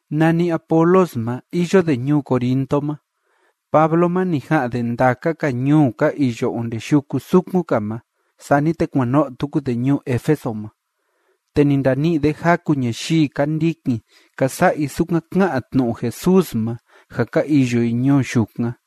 Nani Apolos ma, iyo de ñuu Corinto ma, Pablo ma, ni ja'an de ndaka‑ka ñuu ka iyo onde yuku sukun‑ka ma, sani te kuan no'o tuku de ñuu Éfeso ma. Te ni ndani'i de jaku ñayii ka ndikin ka sa'a i sukan ká'an tnu'u Jesús ma ja ka iyo i ñuu yukan.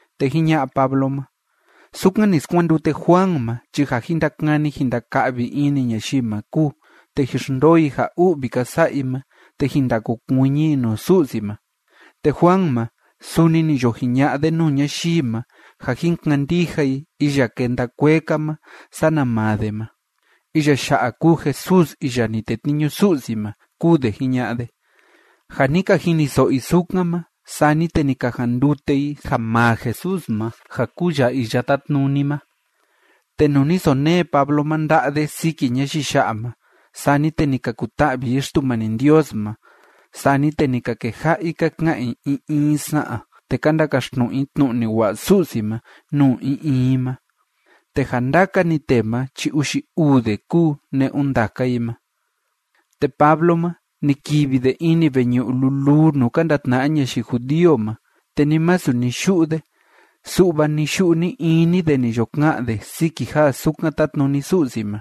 Te jiña'a Pablo ma: ―Sukan ni skuandute Juan ma chi ja jin ndakani jin ndaka'vi ini ñayii ma kúu. Te jin xndoo i ja u'vi ka sa'a i ma, te jin ndakokuiñi i nuu Su'si ma. Te Juan ma suni ni yo jiña'a de nuu ñayii ma ja jin kandija i iya kenda kuee‑ka ma sana maa de ma. Iya ya'a kúu Jesús iya ni tetniñu Su'si ma ―kúu de jiña'a de. Ja ni ka jiniso'o i sukan ma, sani te ni ka jandute i ja maa Jesús ma ja kúu ya Iya Tátnuni ma. Te nuu ni sonee Pablo ma nda'a de siki ñayii ya'a ma, sani te ni ka kuta'vi i Xtumani Ndios ma, sani te ni ka keja'a i ka ka'an i in in sa'an, te ka ndakaxtnu'u i tnu'u ni wa'a Su'si ma nuu in in i ma. Te ja ndaka‑ni tee ma chi uxi uu de kúu ne'un ndaka i ma. Te Pablo ma, ni kivi de ini veñu'u luluu nuu ka ndatna'a ñayii judío ma, te ni masu ni yu'u de, su'va ni‑yu'u ni‑ini de ni yo ka'an de siki ja sukan tátnuni Su'si ma.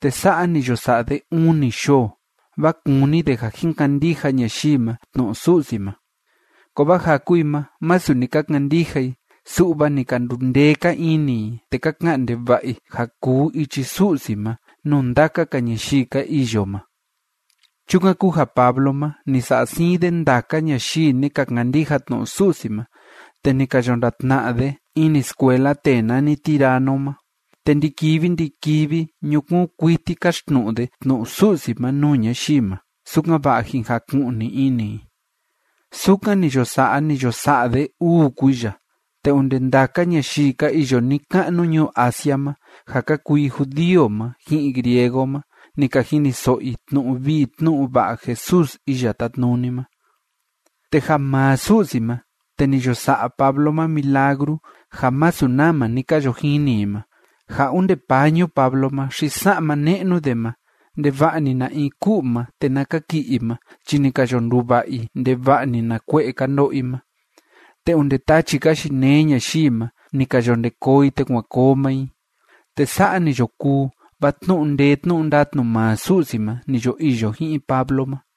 Te sa'a ni yo sa'a de uni yoo, vaa kúni de ja jin kandija ñayii ma tnu'u Su'si ma. Kovaa jaku i ma, masu ni ka kandija i, su'va ni ka ndundee‑ka ini i, te ka ka'an ndeva'a i ja kuu ichi Su'si ma nuu ndaka‑ka ñayii ka iyo ma. Chukan kúu ja Pablo ma, ni sa'a siin de ndaka ñayii ni ka kandija tnu'u Su'si ma, te ni ka yo ndatna'a de ini skuela tee nani Tirano ma, te ndi‑kivi ndi‑kivi ñukuun kuiti káxtnu'u de tnu'u Su'si ma nuu ñayii ma, sukan‑va'a jin jaku'ni ini i. Sukan ni yo sa'a, ni yo sa'a de uu kuiya, te onde ndaka ñayii ka iyo ni‑ka'nu ñuu Asia ma, ja ka kuu i judío ma ji'in griego ma, ni ka jiniso'o i tnu'u vii tnu'u va'a Jesús Iya Tátnuni ma. Te ja maa Su'si ma, te ni yo sa'a Pablo ma milagru ja masu nama ni ka yo jini i ma, ja onde pañu Pablo ma xi sa'ma ne'nu de ma, ndeva'a‑ni na in ku'u ma te na kaki'i i ma chi ni ka yo nduva'a i ndeva'a‑ni na kue'e ka ndo'o i ma, te onde tachi ka yinee ñayii ma, ni ka yo nde koo i te kuan koo maa i. Te sa'a ni yo kuu, vaa tnu'u ndee tnu'u ndatnu maa Su'si ma ni yo iyo ji'in Pablo ma.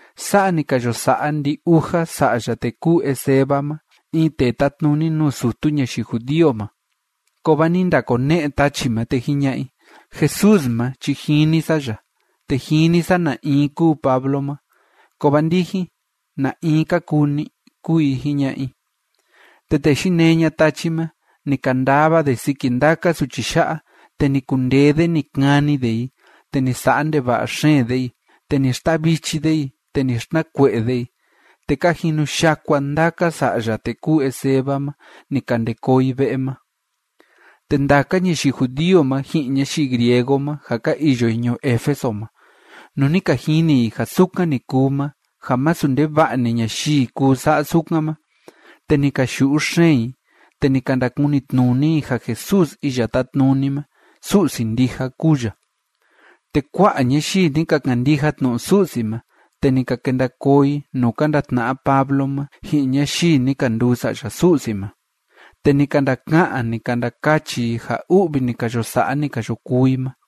Sa'a ni ka yo sa'a ndi‑uja sa'ya tee kúu Esceva ma in tee tátnuni nuu sutu ñayii judío ma. Kovaa ni ndakone'e tachi ma, te jiña'a i: ―Jesús ma chi jini sa ya, te jini sa na in kúu Pablo ma, kovaa ndijin, ¿na in ka kuu ni? ―kúu i jiña'a i. Te tee yinee ña'a tachi ma, ni kandava de siki ndaka suchi ya'a, te ni kundee de ni kani de i, te ni sa'a ndeva'a xeen de i, te ni xtavichi de i, te ni xtnakue'e de i, te ka jinu yakua ndaka sa'ya tee kúu Esceva ma, ni ka nde koo i ve'e ma. Te ndaka ñayii judío ma ji'in ñayii griego ma ja ka iyo i ñuu Éfeso ma, nuu ni ka jini i ja sukan ni kuu ma ja masu ndeva'a‑ni ñayii kuu sa'a sukan ma, te ni ka yu'u xeen i, te ni ka ndakunitnuni i ja Jesús Iya Tátnuni ma, Su'si ndija kúu ya. Te kua'a ñayii ni ka kandija tnu'u Su'si ma, te ni ka kenda koo i nuu ka ndatna'a Pablo ma ji'in ñayii ni ka nduu sa'ya Su'si ma, te ni ka ndaka'an, ni ka ndakachi i ja u'vi ni ka yo sa'a, ni ka yo kuu i ma.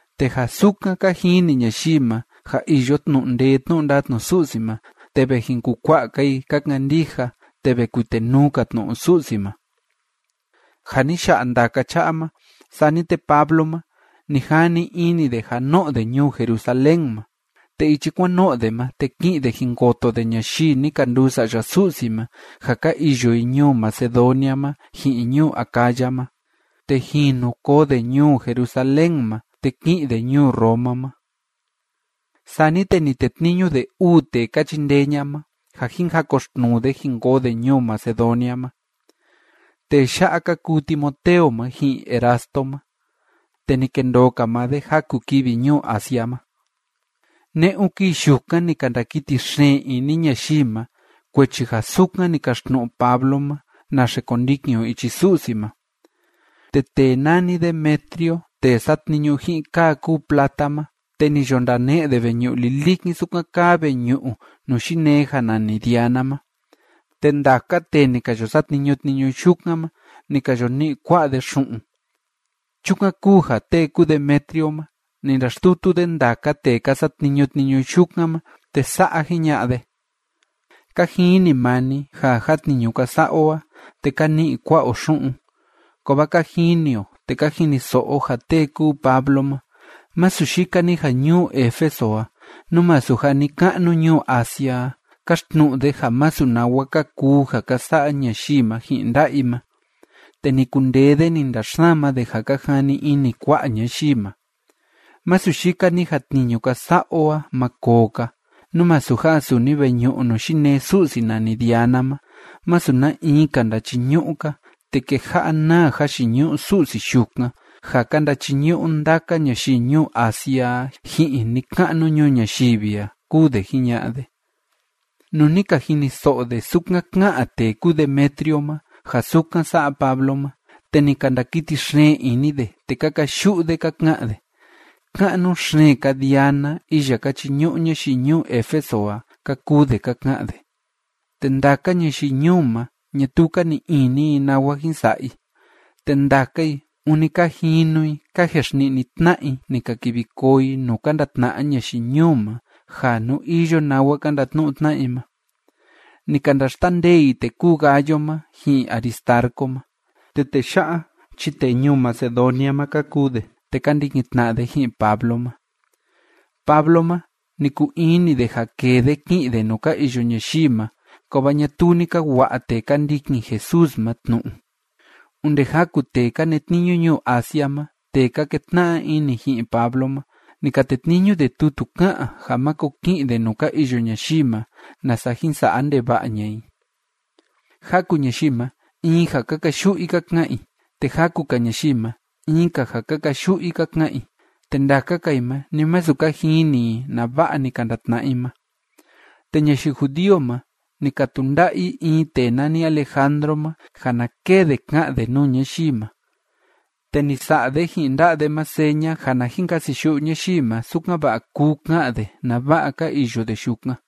Te ja sukan ka jini ñayii ma ja iyo tnu'u ndee tnu'u ndatnu Su'si ma, te ve jin kukua'a‑ka i ka kandija, te ve kuitenuu‑ka tnu'u Su'si ma. Ja ni ya'a ndaka cha'a ma, sani te Pablo ma, ni jani ini de ja no'o de ñuu Jerusalén ma, te ichi kuan no'o de ma, te ki'in de jin koto de ñayii ni ka nduu sa'ya Su'si ma ja ka iyo i ñuu Macedonia ma ji'in ñuu Acaya ma. Te jinu koo de ñuu Jerusalén ma, te ki'in de ñuu Roma ma. Sani te ni tetniñu de uu tee ka chindee ña'a ma, ja jin jakoxtnuu de jin koo de ñuu Macedonia ma. Tee ya'a ka kuu Timoteo ma, ji'in Erasto ma. Te ni kendoo‑ka maa de jaku kivi ñuu Asia ma. Ne'un kii yukan ni ka ndakiti xeen ini ñayii ma kuechi ja sukan ni kaxtnu'u Pablo ma naxe kondikin o ichi Su'si ma. Te tee nani Demetrio tee satniñu ji'in kaa kúu plata ma, te ni yo ndane'e de veñu'u lilikin sukan kaa veñu'u nuu yinee ja nani Diana ma, te ndaka tee ni ka yo satniñu tniñu yukan ma, ni ka yo ni'i kua'a de xu'un. Chukan kúu ja tee kúu Demetrio ma, ni ndaxtutu de ndaka tee ka satniñu tniñu yukan ma, te sa'a jiña'a de: ―Ka jini maa ni ja ja tniñu ka sa'a o a, te ka ni'i kua'a o xu'un. Kovaa ka jini o te ka jiniso'o o ja tee kúu Pablo ma, masu yika‑ni ja ñuu Éfeso a, nú masu ja ni‑ka'nu ñuu Asia a, káxtnu'u de ja masu nawa ka kuu ja ka sa'a ñayii ma ji'in nda'a i ma, te ni kundee de ni ndaxsama de ja ka jani ini kua'a ñayii ma. Masu yika‑ni ja tniñu ka sa'a o a ma koo‑ka, nú masu ja suni veñu'u nuu yinee su'si nani Diana ma, masu na in‑ka ndachiñu'u‑ka, te keja'a naa jayiñu'u su'si yukan ja ka ndachiñu'u ndaka ñayii ñuu Asia a ji'in ni‑ka'nu ñuu ñayivi a ―kúu de jiña'a de. Nuu ni ka jiniso'o de sukan ká'an tee kúu Demetrio ma ja sukan sa'a Pablo ma, te ni ka ndakiti xeen ini de, te ka kayu'u de ka ka'an de: ―¡Ka'nu xeen‑ka Diana iya ka chiñu'u ñayii ñuu Éfeso a! ―ka kuu de ka ka'an de. Te ndaka ñayii ñuu ma, ñatuu ka ni'i ini i nawa jin sa'a i. Te ndaka i, ûni ka jinu i ka jexni'ni tna'a i ni ka kivi koo i nuu ka ndatna'a ñayii ñuu ma ja nú iyo nawa ka ndatnu'u tna'a i ma. Ni ka ndaxtandee i tee kúu Gayo ma, ji'in Aristarco ma, te tee ya'a chi tee ñuu Macedonia ma ka kuu de, te ka ndikin tna'a de ji'in Pablo ma. Pablo ma, ni kuu ini de ja kee de ki'in de nuu ka iyo ñayii ma. Kovaa ñatuu ni ka wa'a tee ka ndikin Jesús ma tnu'u. Onde jaku tee ka netniñu ñuu Asia ma tee ka ketna'a ini ji'in Pablo ma, ni ka tetniñu de tutu ká'an ja máko ki'in de nuu ka iyo ñayii ma, nasa jin sa'a ndeva'a ña'a i. Jaku ñayii ma, in ja ka kayu'u i ka ka'an i, te jaku‑ka ñayii ma, in‑ka ja ka kayu'u i ka ka'an i, te ndaka‑ka i ma, ni masu ka jini i nava'a ni ka ndatna'a i ma. Te ñayii judío ma, ni ka tunda'a i in tee nani Alejandro ma, ja na kee de ka'an de nuu ñayii ma. Te ni sa'a de ji'in nda'a de ma seña ja na jin kasiyu'u ñayii ma, sukan‑va'a kuu ka'an de nava'a ka iyo de yukan.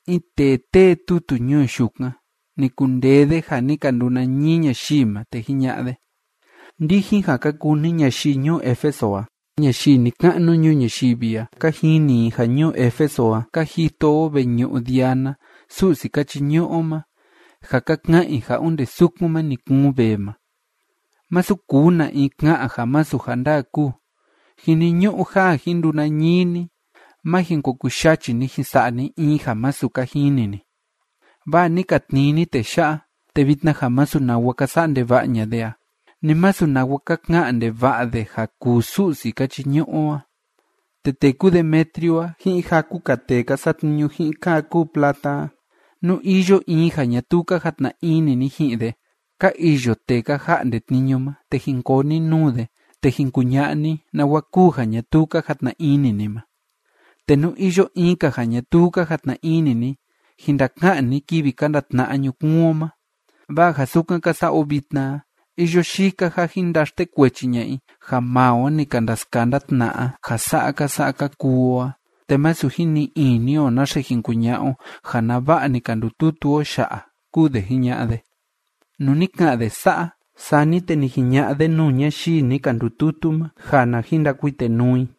In tee tee tutu ñuu yukan, ni kundee de ja ni ka ndunañii ñayii ma, te jiña'a de: ―Ndijin ja ka kuu ni ñayii ñuu Éfeso a, ñayii ni‑ka'nu ñuu ñayivi a, ka jini i ja ñuu Éfeso a ka jito o veñu'u Diana su'si ka chiñu'u o ma, ja ka ka'an i ja onde sukun ma ni kuun vee ma. Masu kuu na in ka'an ja masu ja ndaa kúu. Jiniñu'u ja jin ndunañii ni. Má jin ko kuyachi ni ja jin sa'a ni in ja masu ka jini ni. Vaa ni ka tnii ni tee ya'a, te vitna ja masu nawa ka sa'a ndeva'a ña'a de a, ni masu nawa ka ka'an ndeva'a de ja kuu su'si ka chiñu'u o a. Te tee kúu Demetrio a ji'in jaku‑ka tee ka satniñu ji'in kaa kúu plata a, nú iyo in ja ñatuu ka jatna ini ni ji'in de, ka iyo tee ka ja'nde tniñu ma, te jin koo ni nuu de, te jin kuña'a ni nawa kúu ja ñatuu ka jatna ini ni ma. Te nú iyo in‑ka ja ñatuu ka jatna ini ni, jin ndaka'an ni kivi ka ndatna'a ñukuun o ma. Vaa ja sukan ka sa'a o vitna a, iyo yika ja jin ndaxtekuechi ña'a i ja maa o ni ka ndaskanda tna'a ja sa'a ka sa'a ka kuu o a, te masu jin ni'i ini o naxe jin kuña'a o ja nava'a ni ka ndututu o ya'a ―kúu de jiña'a de. Nuu ni ka'an de sa'a, sani te ni jiña'a de nuu ñayii ni ka ndututu ma ja na jin ndakuitenuu i.